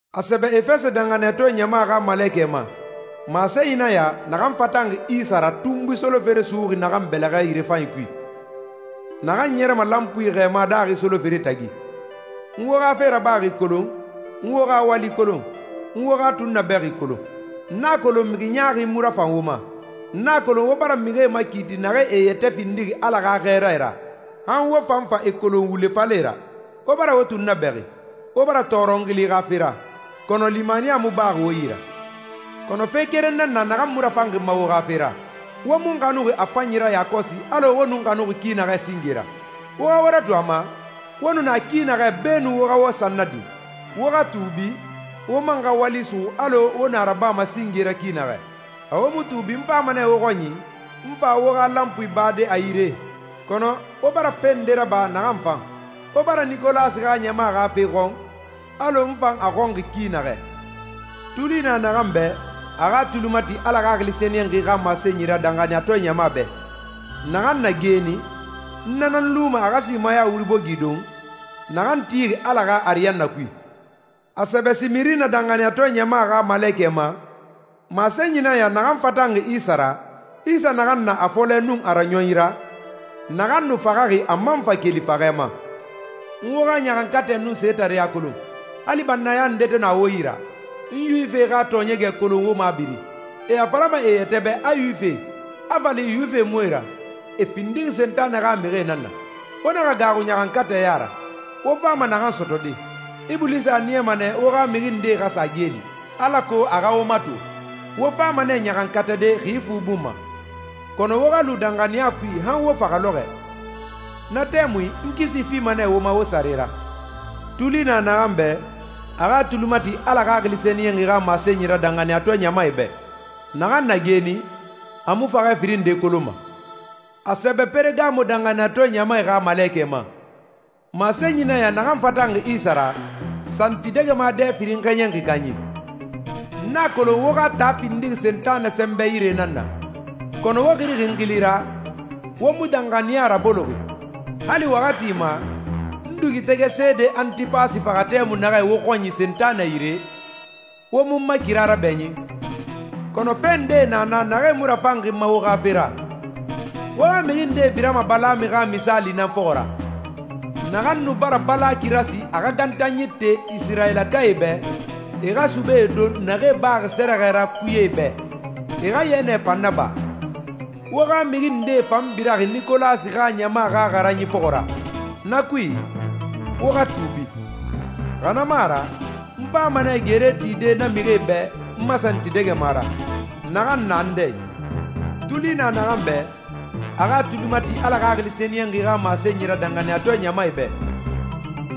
A sɛbɛ Efɛsɛ danxaniyatɔɛ ɲama xa malekɛ ma, masenyi nan ya naxan fatanxi Isa ra tunbui solofere suxuxi naxan yirefanyi bɛlɛxɛ kui, naxan ɲɛrɛma lanpui xɛɛma daaxi solofere tagi: «N wo xa fe rabaxi kolon, n wo xa wali kolon, n wo xa tunnabɛxi kolon. N a kolon mixi ɲaaxie mu rafan wo ma. N a kolon wo bara mixie makiiti naxee e yɛtɛ findixi Ala xa xɛɛrae ra, han wo fan fa e kolon wule falɛe ra. Wo bara wo tunnabɛxi, wo bara tɔɔrɔ n xili xa fe ra, kɔnɔ limaniya mu baxi wo yi ra.» «Kɔnɔ fe keren na na naxan mu rafanxi n ma wo xa fe ra. Wo mu n xanuxi a fanyi ra yakɔsi alɔ wo nu n xanuxi ki naxɛ singe ra. Wo xa wo ratu a ma, wo nu na ki naxɛ beenun wo xa wo san nadin. Wo xa tuubi, wo man xa wali suxu alɔ wo nu a rabama singe ra ki naxɛ. Xa wo mu tuubi n fama nɛ wo xɔnyi, n fa wo xa lanpui bade a yire.» «Kɔnɔ wo bara fe nde raba naxan fan. Wo bara Nikolasi xa ɲama xa fe xɔn, alɔ n fan a xɔnxi ki naxɛ.» «Tuli na naxan bɛ, a xa a tuli mati Ala Xaxili Sɛniyɛnxi xa masenyi ra danxaniyatɔɛ ɲamae bɛ. Naxan na geeni, n na nan luma a xa simaya wuri bogi don, naxan tixi Ala xa ariyanna kui.» A sɛbɛ Simirina danxaniyatɔɛ ɲama xa malekɛ ma, masenyi nan ya naxan fatanxi Isa ra, Isa naxan na a fɔlɛ nun a raɲɔnyi ra, naxan nu faxaxi a man fa keli faxɛ ma: «N wo xa ɲaxankatɛ nun setareɲa kolon, hali bannaya nde to na wo yi ra. N Yuwifie xa tɔɔɲɛgɛ kolon wo mabiri. E a falama e yɛtɛ bɛ a Yuwifie, a fa li Yuwifie mu e ra. E findixi Sentanɛ xa mixie nan na. Wo naxa gaaxu ɲaxankatɛ ya ra, wo fama naxan sɔtɔde. Ibulisa a niyama nɛ wo xa mixi ndee xa sa geeli, alako a xa wo mato. Wo fama nɛ ɲaxankatade xi fu bun ma. Kɔnɔ wo xa lu danxaniya kui han wo faxɛ lɔxɔɛ. Na tɛmui n kisi fima nɛ wo ma wo sare ra.» «Tuli na naxan bɛ, a xa a tuli mati Ala Xaxili Sɛniyɛnxi xa masenyi ra danxaniyatɔɛ ɲamae bɛ. Naxan na geeni, a mu faxɛ firin nde kolonma.» A sɛbɛ Peregamo danxaniyatɔɛ ɲama xa malekɛ ma, masenyi nan ya naxan fatanxi Isa ra, santidɛgɛma dɛ firin xɛɲɛnxi kanyi: «N a kolon wo xa taa findixi Sentanɛ sɛnbɛ yire nan na, kɔnɔ wo xirixi n xili ra, wo mu danxaniya raboloxi. Hali waxati ma, n dugutɛgɛ seede Antipasi faxa tɛmui naxɛ wo xɔnyi Sentanɛ yire, wo mu n ma kira rabɛɲin.» «Kɔnɔ fe ndee na na naxee mu rafanxi n ma wo xa fe ra. Wo xa mixi ndee birama Balami xa misaali nan fɔxɔ ra, naxan nu bara Balaki rasi a xa gantanyi te Isirayilakae bɛ, e xa subee don naxee baxi sɛrɛxɛ ra kuyee bɛ, e xa yɛnɛ fan naba. Wo xa mixi ndee fan biraxi Nikolasi xa ɲama xa xaranyi fɔxɔ ra. Na kui, wo xa tuubi, xa na mu a ra n fama nɛ gere tide na mixie bɛ n ma santidɛgɛma ra, naxan na n dɛ i.» «Tuli na naxan bɛ, a xa a tuli mati Ala Xaxili Sɛniyɛnxi xa masenyi ra danxaniyatɔɛ ɲamae bɛ.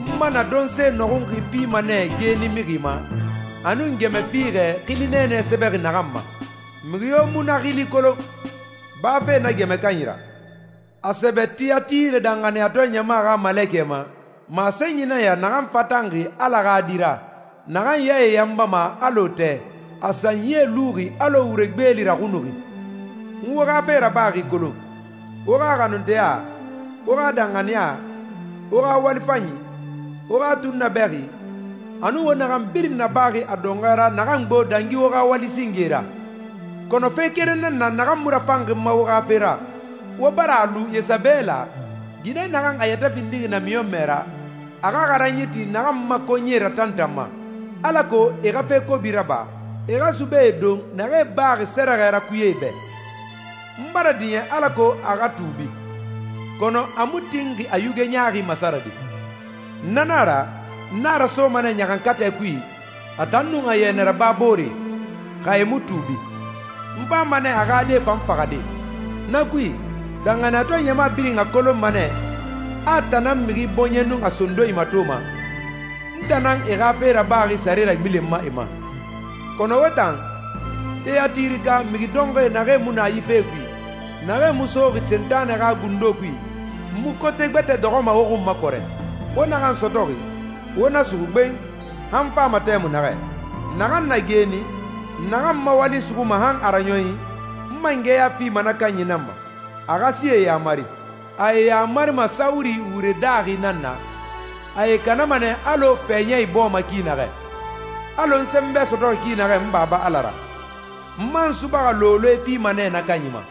N ‹mana› donse nɔxunxi fima nɛ geeni mixi ma, a nun gɛmɛ fiixɛ, xili nɛɛnɛ sɛbɛxi naxan ma. Mixi yo mu na xili kolon, bafe na gɛmɛ kanyi ra.» A sɛbɛ Tiyatire danxaniyatɔɛ ɲama xa malekɛ ma, masenyi nan ya naxan fatanxi Ala xa Di ra, naxan yae yanbama alɔ tɛ, a sanyie luxi alɔ wure gbeeli raxunuxi: «N wo xa fe rabaxi kolon, wo xa xanunteya, wo xa danxaniya, wo xa wali fanyi, wo xa tunnabɛxi, a nun wo naxan birin nabaxi a dɔnxɔɛ ra naxan gbo dangi wo xa wali singee ra.» «Kɔnɔ fe keren na na naxan mu rafanxi n ma wo xa fe ra. Wo bara a lu Yesabela, ginɛ naxan a yɛtɛ findixi namiɲɔnmɛ ra, a xa xaranyi ti naxan n ma konyie ratantanma, alako e xa fe kobi raba, e xa subee don naxee baxi sɛrɛxɛ ra kuyee bɛ. N bara diɲɛ alako a xa tuubi, kɔnɔ a mu tinxi a yuge ɲaaxi masarade. Na na a ra, n a rasoma nɛ ɲaxankatɛ kui, a tan nun a yɛnɛ raba booree, xa e mu tuubi. N fama nɛ a xa die fan faxade. Na kui, danxaniyatɔɛ ɲama birin a kolonma nɛ a n tan nan mixi bɔɲɛ nun a sondonyi matoma, n tan nan e xa fe rabaxi sare ragbilenma e ma.» «Kɔnɔ wo tan, Tiyatireka mixi dɔnxɔɛ naxee mu na yi fe kui, naxee mu soxi Sentanɛ xa gundo kui, n mu kote gbɛtɛ dɔxɔma wo xun ma kɔrɛ. Wo naxan sɔtɔxi, wo na suxu gben, han n fama tɛmui naxɛ. Naxan na geeni, naxan n ma wali suxuma han a raɲɔnyi, n mangɛya fima na kanyi nan ma, a xa sie yamari. ‹A e yamarima sawuri wure daaxi nan na, a e kanama nɛ alɔ fɛɲɛ ibɔɔma ki naxɛ›, alɔ n sɛnbɛ sɔtɔxi ki naxɛ n Baba Ala ra. N man subaxa looloe fima nɛ na kanyi ma.»